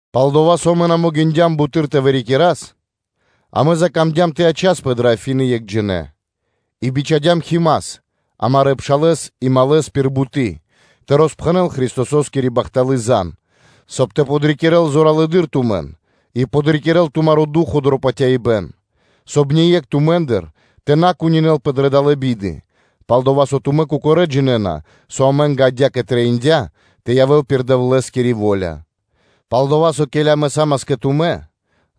Пал-дова́ со амэ на могиндям буты́р тэ вырикирас, амэ закамдям тэ ячаспэ кэ Афины екхджинэ, и бичхадям Химас, амарэ́ пшалэ́с и малэс пир буты́ тэ роспхэнэл Христососкири бахталы́ зан (звесь), соб (кай) ёв тэ подрикирэ́л зоралэды́р тумэн и тэ подрикирэ́л тумаро́ ду́хо (фа́но) дро патяибэ́н, соб (кай) ние́кх тумэ́ндыр тэ на кунинэлпэ дрэ далэ́ биды: пал-дова́ со тумэ́ кокорэ́ джинэ́на, со амэ́нгэ адя́кэ трэиндя́ тэ явэ́л пир Дэвлэ́скири во́ля; пал-дова́ со, ке́ли амэ са́мас кэ тумэ́,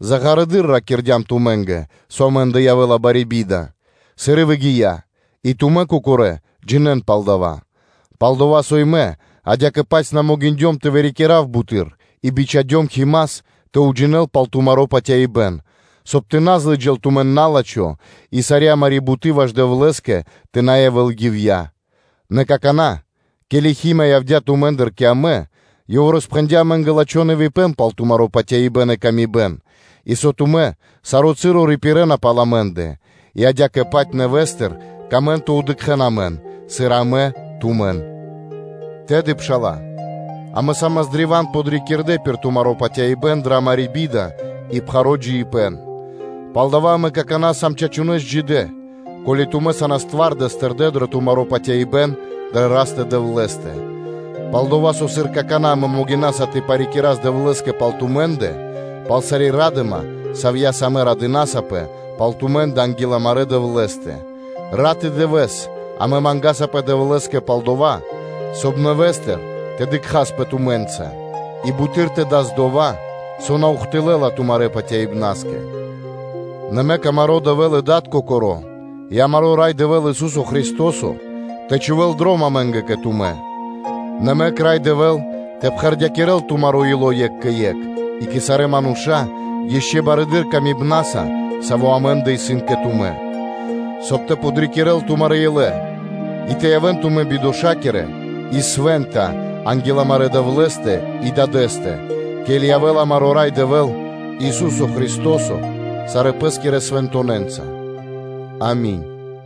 заґарэдыр ракирдям тумэ́нгэ, со амэ́ндэ явэ́ла бари би́да, сыр и выгия́, и тумэ́ кокорэ́ джинэ́на пал дава́. Пал-дова́ и мэ адя́кэ-паць на могиндём тэ вырикирав буты́р и бичхадём Химас тэ уджинэл пал тумаро́ патяибэ́н, соб (кай) тэ на злыджал тумэн на́лачхо и сари́ амари́ буты́ ваш Дэвлэ́скэ тэ на явэ́л ивья́ (напра́снэс). Нэ какана́, ке́ли Хима явдя́ тумэ́ндыр кэ амэ, ёв роспхэндя́ амэ́нгэ лачхо́ нэвипэн пал тумаро́ патяибэ́н и паты́в кэ яви́р мануша́, и со тумэ́ саро́ часо рипирэна пал амэ́ндэ, и адя́кэ-паць нэвэ́стыр камэ́на тэ дыкхэ́н амэн, сыр и амэ тумэн, Тэды, пшала́лэ, амэ са́мас древа́н подрикирдэ пир тумаро́ патяибэ́н дрэ амари́ би́да и пхаро́ джиибэ́н, Палдава́ амэ какана́ сам чачунэ́с джидэ́, ко́ли тумэ́ сан твардэс тэрдэ́ дро тумаро́ патяибэ́н дрэ Растэ-Дэвлэ́стэ. Пал-дова́ со, сыр какана́ амэ могинаса тэ парикирас Дэвлэ́скэ пал тумэ́ндэ, пал сари́ ра́дыма, савья́са амэ радынасапэ пал тумэ́ндэ анги́л амарэ́ Дэвлэ́стэ, рат и дывэ́с амэ мангасапэ Дэвлэ́скэ пал-дова́, соб (кай) нэвэ́стыр тэ дыкхаспэ тумэ́нца и буты́р тэ дас дова́, со на ухты́лла тумарэ́ патяибнаскэ. Нэ мэк амаро́ Дэвэ́л и Дад Кокоро́ и амаро́ Рай Дэвэ́л, Ису́со Христо́со тэ чхувэ́л дром амэ́нгэ кэ тумэ́. Нэ мэк Рай Дэвэ́л тэ пхэрдякирэл тумаро́ ило́ екх кэ екх и кэ сарэ́ мануша́ ишчо (инкэ́) барэды́р ласкаса, сави́ амэ́ндэ исын кэ тумэ́, соб (кай) тэ подрикирэ́л тумарэ́ илэ тэ явэ́н тумэ́ бидошакирэ и свэ́нта анги́л амарэ́ Дэвлэ́стэ и Дадэ́стэ, ке́ли явэ́ла амаро́ Рай Дэвэ́л, Ису́со Христо́со сарэ́ Пэ́скирэ свэнтонэнца. Ами́нь.